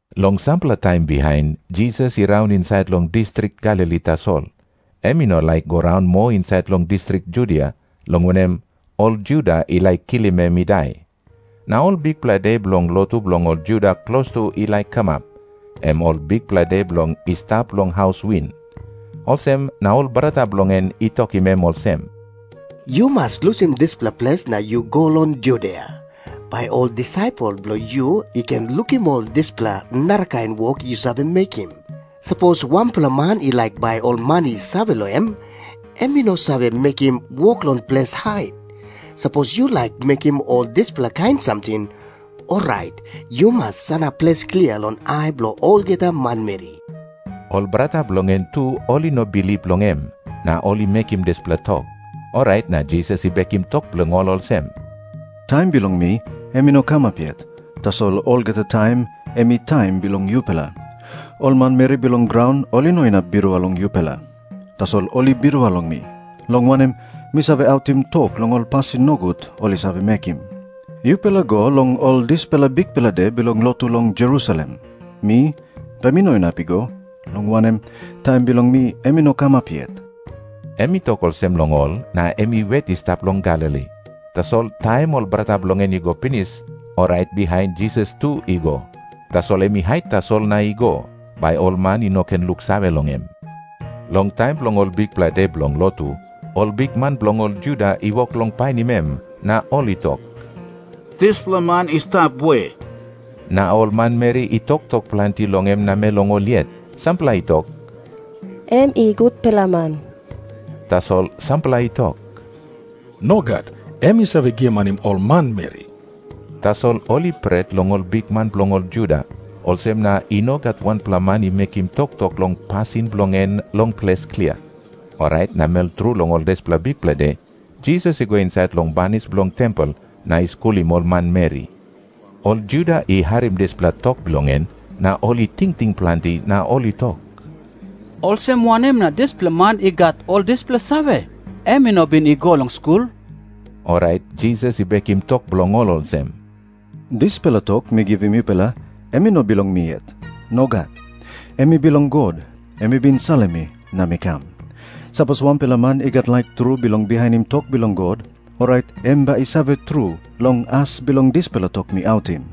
Long sampela taim bihain, Jisas i raun insait long distrik Galili tasol. Em i no laik i go raun moa insait long distrik Judia, long anem, ol Juda i laik kilim em i dai. Na ol bikpela de bilong lotu bilong ol Juda klostu ol i laik kamap, em Ol Bikpela De Bilong I Stap Long Haus Win. Olsem na ol brata bilong en i tokim em olsem, “Yu mas lusim dispela ples na yu go long Judia, bai ol disaipel bilong yu i ken lukim ol dispela narakain wok yu save mekim. Sapos wanpela man i laik bai ol man i save long em, em i no save mekim wok long ples hait. Sapos yu laik mekim ol dispela kain samting, orait yu mas sanap ples klia long ai bilong olgeta manmeri.” Ol brata bilong en tu ol i no bilip long em, na ol i mekim dispela tok. Orait na Jisas i bekim tok bilong ol olsem, “Taim bilong mi em i no kamap yet. Tasol olgeta taim em i taim bilong yupela. Ol manmeri bilong graun ol i no inap birua long yupela. Tasol ol i birua long mi, long wanem, mi save autim tok long ol pasin nogut ol i save mekim. Yupela go long ol dispela bikpela de bilong lotu long Jerusalem. Mi, bai mi no inap i go, long wanem, taim bilong mi em i no kamap yet.” Em i tok olsem long ol, na em i wet i stap long Galili. Tasol taim ol brata bilong en i go pinis, orait bihain Jisas tu i go. Tasol em i hait tasol na i go, bai ol man i no ken luksave long em. Long taim bilong ol bikpela de bilong lotu, ol bikman bilong ol Juda i wok long painim em, na ol i tok, “Dispela man i stap we?” Na ol manmeri i toktok planti long em namel long ol yet. Sampela i tok, “Em i gutpela man.” Tasol sampela i tok, “Nogat. Em i save giamanim ol manmeri.” Tasol ol i pret long ol bikman bilong ol Juda, olsem na i no gat wanpela man i mekim toktok long pasin bilong en long ples klia. Orait namel tru long ol dispela bikpela de, Jisas i go insait long banis bilong tempel na i skulim ol manmeri. Ol Juda i harim dispela tok bilong en, na ol i tingting planti na ol i tok, “Olsem wanem na dispela man i gat ol dispela save? Em i no bin i go long skul.” Orait Jisas i bekim tok bilong ol olsem, “Dispela tok mi givim yupela, em i no bilong mi yet. Nogat. Em i bilong God, em i bin salim mi na mi kam. Sapos wanpela man i gat laik tru bilong bihainim tok bilong God, orait em bai i save tru long as bilong dispela tok mi autim.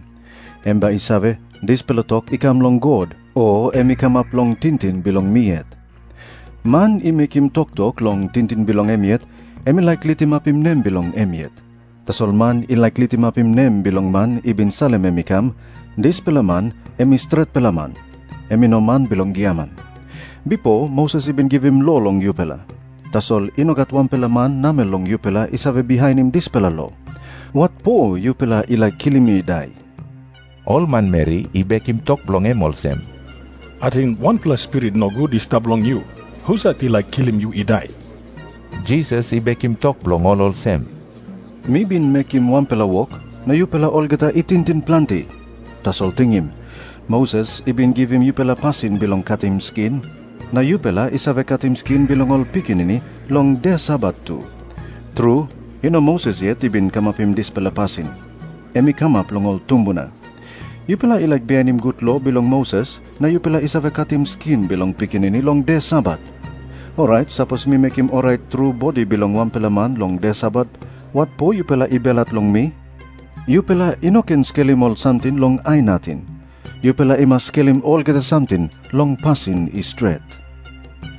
Em bai i save, dispela tok i kam long God, o em i kamap long tingting bilong mi yet. Man i mekim toktok long tingting bilong em yet, em i laik litimapim nem bilong em yet. Tasol man i laik litimapim nem bilong man i bin salim em i kam, dispela man em i stretpela man. Em i no man bilong giaman. “Bipo Moses i bin givim lo long yupela. Tasol i no gat wanpela man namel long yupela i save bihainim dispela lo. Watpo yupela i laik kilim mi i dai?” Ol manmeri i bekim tok bilong em olsem, “Ating wanpela spirit nogut i stap long yu. Husat i laik kilim yu i dai?” Jisas i bekim tok bilong ol olsem, “Mi bin mekim wanpela wok, na yupela olgeta i tingting planti. Tasol tingim. Moses i bin givim yupela pasin bilong katim skin, na yupela i save katim skin bilong ol pikinini long de Sabat tu. Tru, i no Moses yet i bin kamapim dispela pasin. Em i kamap long ol tumbuna. Yupela i laik bihainim gut lo bilong Moses, na yupela i save katim skin bilong pikinini long de Sabat. Orait sapos mi mekim orait tru bodi bilong wanpela man long de Sabat, watpo yupela i belhat long mi? Yupela i no ken skelim ol samting long ai nating. Yupela i mas skelim olgeta samting long pasin i stret.”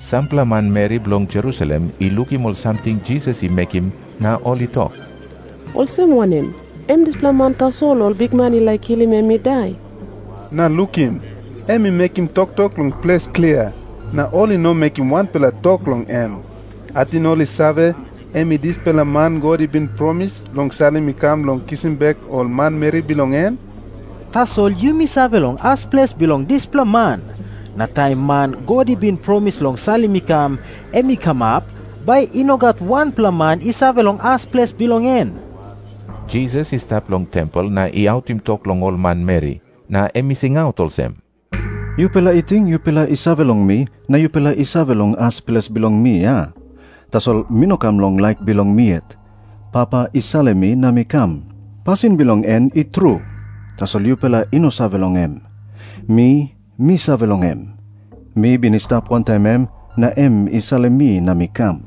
Sampela manmeri bilong Jerusalem i lukim ol samting Jisas i mekim na ol i tok, “Olsem wanem? Em dispela man tasol ol bikman i laik kilim em i dai. Na lukim. Em i mekim toktok long ples klia, na ol i no mekim wanpela tok long em. Ating ol i save, em i dispela man God i bin promis long salim i kam bilong kisim bek ol manmeri bilong en? Tasol yumi save long as ples bilong dispela man. Na taim man God i bin promis long salim i kam, em i kamap, bai i no gat wanpela man i save long as ples bilong en.” Jisas i stap long tempel na i autim tok long ol manmeri. Na em i singaut olsem, “Yupela i ting yupela i save long mi, na yupela i save long as ples bilong mi, a? Tasol mi no kam long laik bilong mi yet. Papa i salim mi na mi kam. Pasin bilong en i tru, tasol yupela i no save long em. Mi, mi save long em. Mi bin i stap wantaim em, na em i salim mi na mi kam.”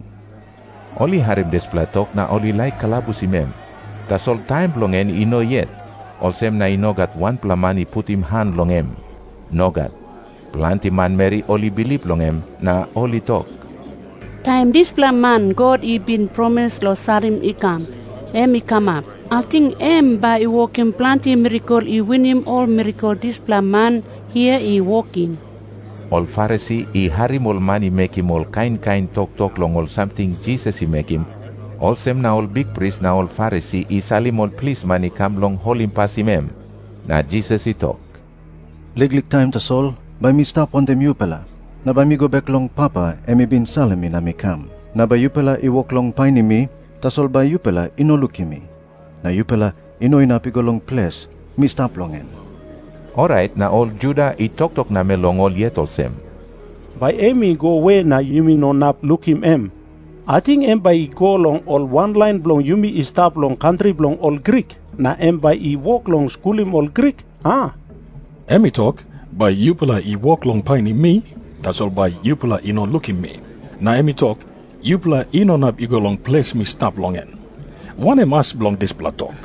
Ol i harim dispela tok na ol i laik kalabusim em. Tasol taim bilong en i no yet, olsem na i no gat wanpela man i putim han long em. Nogat. Planti manmeri ol i bilip long em, na ol i tok, “Taim dispela man God i bin promis long salim i kam, em i kamap, ating em bai i wokim planti mirakel i winim ol mirakel dispela man hia i wokim?” Ol Farisi i harim ol man i mekim ol kain kain toktok long ol samting Jisas i mekim. Olsem na ol bikpris na ol Farisi i salim ol plisman i kam bilong holimpasim em. Na Jisas i tok, “Liklik taim tasol bai mi stap wantaim yupela, na bai mi go bek long Papa, em i bin salim mi na mi kam. Na bai yupela i wok long painim mi, tasol bai yupela i no lukim mi. Na yupela i no inap i go long ples mi stap long en.” Orait na ol Juda i toktok namel long ol yet olsem, “Bai em i go we na yumi no inap lukim em? Ating em bai i go long ol wanlain bilong yumi i stap long kantri bilong ol Grik, na em bai i wok long skulim ol Grik, a? Em i tok, ‘Bai yupela i wok long painim mi, tasol bai yupela i no lukim mi.’ Na em i tok, ‘Yupela i no inap i go long ples mi stap long en.’ Wanem as bilong dispela tok?”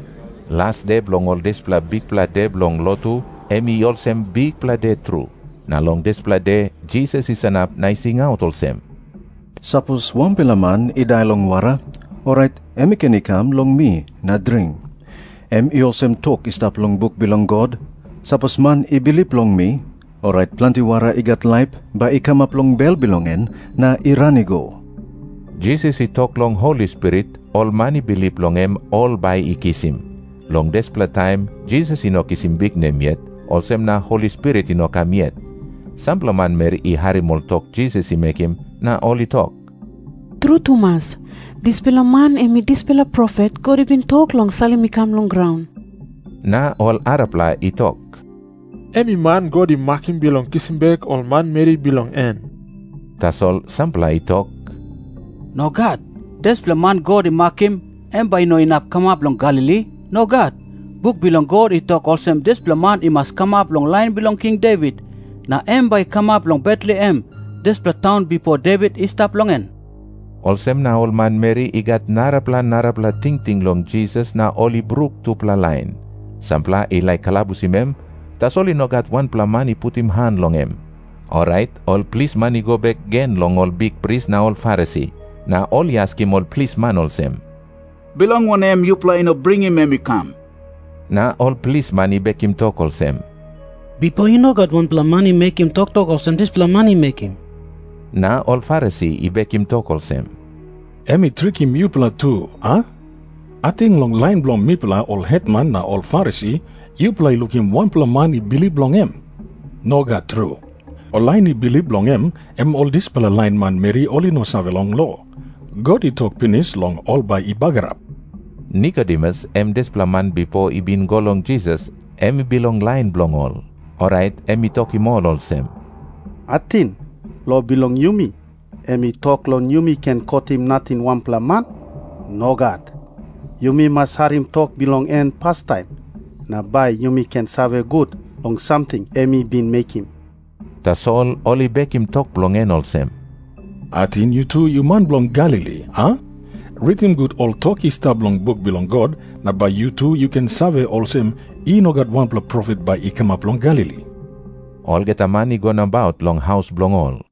Las de bilong ol dispela bikpela de bilong lotu, em i olsem bikpela de tru. Na long dispela de Jisas i sanap na i singaut olsem, “Sapos wanpela man i dai long wara, orait em i ken i kam long mi na dring. Em i olsem tok i stap long buk bilong God, sapos man i bilip long mi, orait planti wara i gat laip bai i kamap long bel bilong en na i ran i go.” Jisas i tok long Holi Spirit ol man i bilip long em ol bai i kisim. Long dispela taim Jisas i no kisim biknem yet, olsem na Holi Spirit i no kam yet. Sampela manmeri i harim ol tok Jisas i mekim na ol i tok, “Tru tumas, dispela man em i dispela profet God i bin tok long salim i kam long graun.” Na ol arapela i tok, “Em i man God i makim bilong kisim bek ol manmeri bilong en.” Tasol sampela i tok, “Nogat. Dispela man God i makim, em bai i no inap kamap long Galili. Nogat. Buk bilong God i tok olsem dispela man i mas kamap long lain bilong King Devit, na em bai i kamap long Betlehem, dispela taun bipo Devit i stap long en.” Olsem na ol manmeri i gat narapela narapela tingting long Jisas na ol i bruk tupela lain. Sampela i laik kalabusim em, tasol i no gat wanpela man i putim han long em. Orait ol plisman i go bek gen long ol bikpris na ol Farisi. Na ol i askim ol plisman olsem, “Bilong wanem yupela i no bringim em i kam?” Na ol plisman i bekim tok olsem, “Bipo i no gat wanpela man i mekim toktok olsem dispela man i mekim.” Na ol Farisi i bekim tok olsem, “Em i trikim yupela tu, a? Ating long lain bilong mipela ol hetman na ol Farisi, yupela i lukim wanpela man i bilip long em? Nogat tru. Ol lain i bilip long em, em ol dispela lain manmeri ol i no save long lo. God i tok pinis long ol bai i bagarap.” Nikodemus, em dispela man bipo i bin i go long Jisas, em i bilong lain bilong ol. Orait em i tokim ol olsem, “Ating lo bilong yumi em i tok long yumi ken kotim nating wanpela man? Nogat. Yumi mas harim tok bilong en pastaim, na bai yumi ken save gut long samting em i bin mekim.” Tasol ol i bekim tok bilong en olsem, “Ating yu tu yu man bilong Galili, a? Ritim gut ol tok i stap long buk bilong God, na bai yu tu yu ken save olsem, i no gat wanpela profet bai i kamap long Galili.” Olgeta man i go nabaut long haus bilong ol,